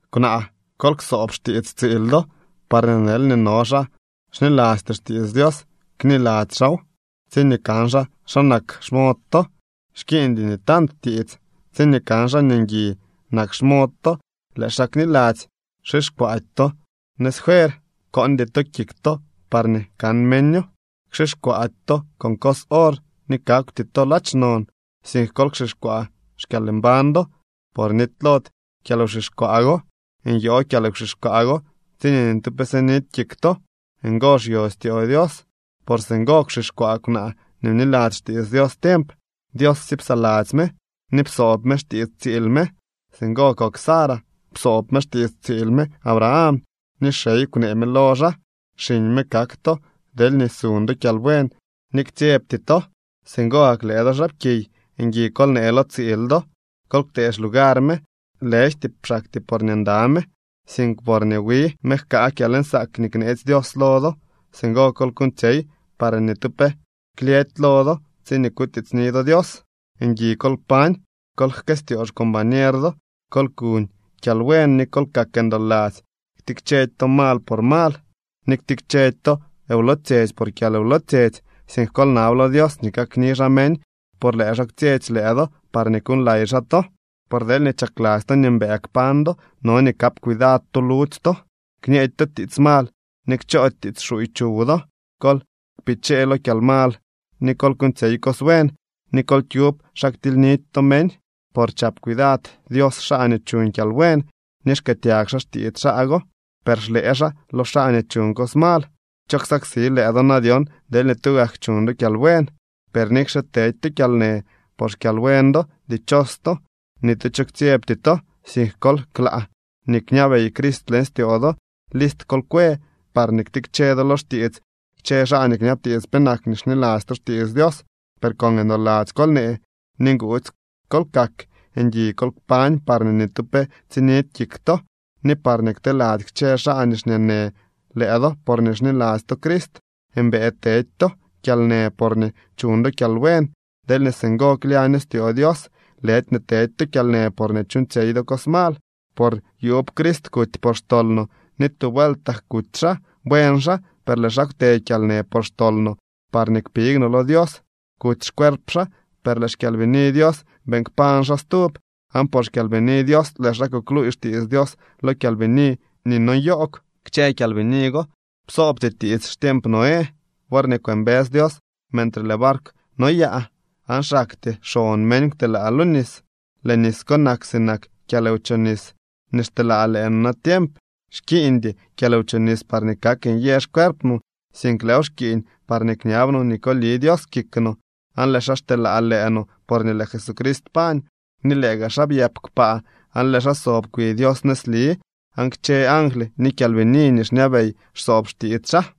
Kwnaa, kol ksoob xtiits tsiil do, parñee deelñee no xaa xnilasty xtiits Dios, kniladzy xaaw tsiñee kan xaa xa nak xmod to. Xkiiñdy nii tant tiits. Tsiñee kan xaa nii ngui nak xmod to, lëë xaa kniladzy. Xixkwaady to nëz fuer, koondy to kik to parñee kan meño, xixkwaady to con cos or ni kakwty to ladx non, sink kol kxixkwaa xkyalmbañ do, por nitylody kyalwxixkwaa go. Nyo kyalwxixkwaa go tsiñee ni tu pe sidy kik to. Ngo xyo styoo Dios. Por singo kwxixkwaa kwnaa nii bniladzy xtiits Dios tiemp. Dios sye psaladzy me ni psoob me xtiits tsiil me. Singo kok Sara. Psoob me xtiits tsiil me Abraham ni “xey” kwnee me lo xaa. Xiñ me kak to deelñee suñ do kyalbuen ni ktsyebty to. Singo gak lëë do xaapkiy, ngui kol nee lo tsiil do. Kol ktee xlugar me, lëjty xaktyee porñee nda me, sink porñee wi me jkaa kyalnsaak nii kneetsy Dios lo do. Singo kol kuuñtsyey parñee ni tu pe klyëdy lo do tsiñee kutiitsni do Dios. Ngui kol kpañ, kol jkëstyoo xcombañer do. Kol kuñ kyalbuen ni kol kak ndoladzy. Ktikchedy to mal por mal, ni ktikchedy to wlotsyetsy por kyalwlotsyetsy, sink kol nab lo Dios nii kakni xaa meñ por lëë xaa kwtsyetsy lëë do parñee kuuñlay xaa to. Por deelñee chakladzy to nii mbëë kpañ do, no nii kap cuidad to ludzy to. Kñeedy to tiits mal ni kchoody tiits xuuy chuw do. Kol kpichee lo kyalmal ni kol kuuñtsyey cos buen, ni kol kyub xa ktilynidy to meñ. Por chap cuidad Dios xaa nii chuñ kyalbuen ni xkëëtyag xaa xtiits xaa go, per xlëë xaa lo xaa nii chuñ cos mal. ¿Cho ksaksi lëë do na dyon deelñee tugak chuñ do kyalbuen? Per nikxe tedy to kyalnë por xkyalbuen do, dichos to. Ni tu cho ktsyebty to, sink kol klaa nii kñabey Crist leñ styoo do. List kol kwe parñee ktikche do lo xtiits kchë xaa nii kñabtiits penak nii xniladzy to xtiits Dios, per con ndoladzy kol nee ni nguudzy kol kak. Ngui kol kpañ parñee ni tu pe tsinidy kik to, ni parñee kteladzy kchë xaa nii xñeenë lëë do porñee xniladzy to Crist. Mbëë tedy to kyalnë porñee chuñ do kyalbuen, deelñee singo klyaño styoo Dios, lëdy nii tedy to kyalnë porñee chuuñtsyey do cos mal. Por yuub Crist kuty por xtol no, ni tu vueltak kuty xaa. Buen xaa, per lëë xaa kwte kyalnë por xtol no, parñee kpig no lo Dios. Kuty xcuerp xaa, per lëë xkyalbini Dios beeñ kpañ xaa stub. Aan por xKyalbini Dios lëë xaa kukluuy xtiits Dios lo kyalbini nii no nyoogw. Kchë kyalbini go psoobty tiits xtiemp Noé, worñee kwëmbës Dios mentre lëë barkw noyaa, aan xaktyee xon meñ kwtelaa lo nis. Lëë nis ko nak sinak kyalwchobnis nii xteelaa lëë no natiemp. Xkiiñdy kyalwchobnis parñee kak nyë xcuerp no, sink lëëw xkiiñ parñee kñab no nii koli Dios kik no, aan lëë xaa xteelaa lëë no porñee lëë Jesucrist pañ, ni lëë gaa xaa byëp kpaa aan lëë xaa sob kwi Dios nëzli aan kchë angly ni kyalbini nii xñabey xsoob xtiits xaa.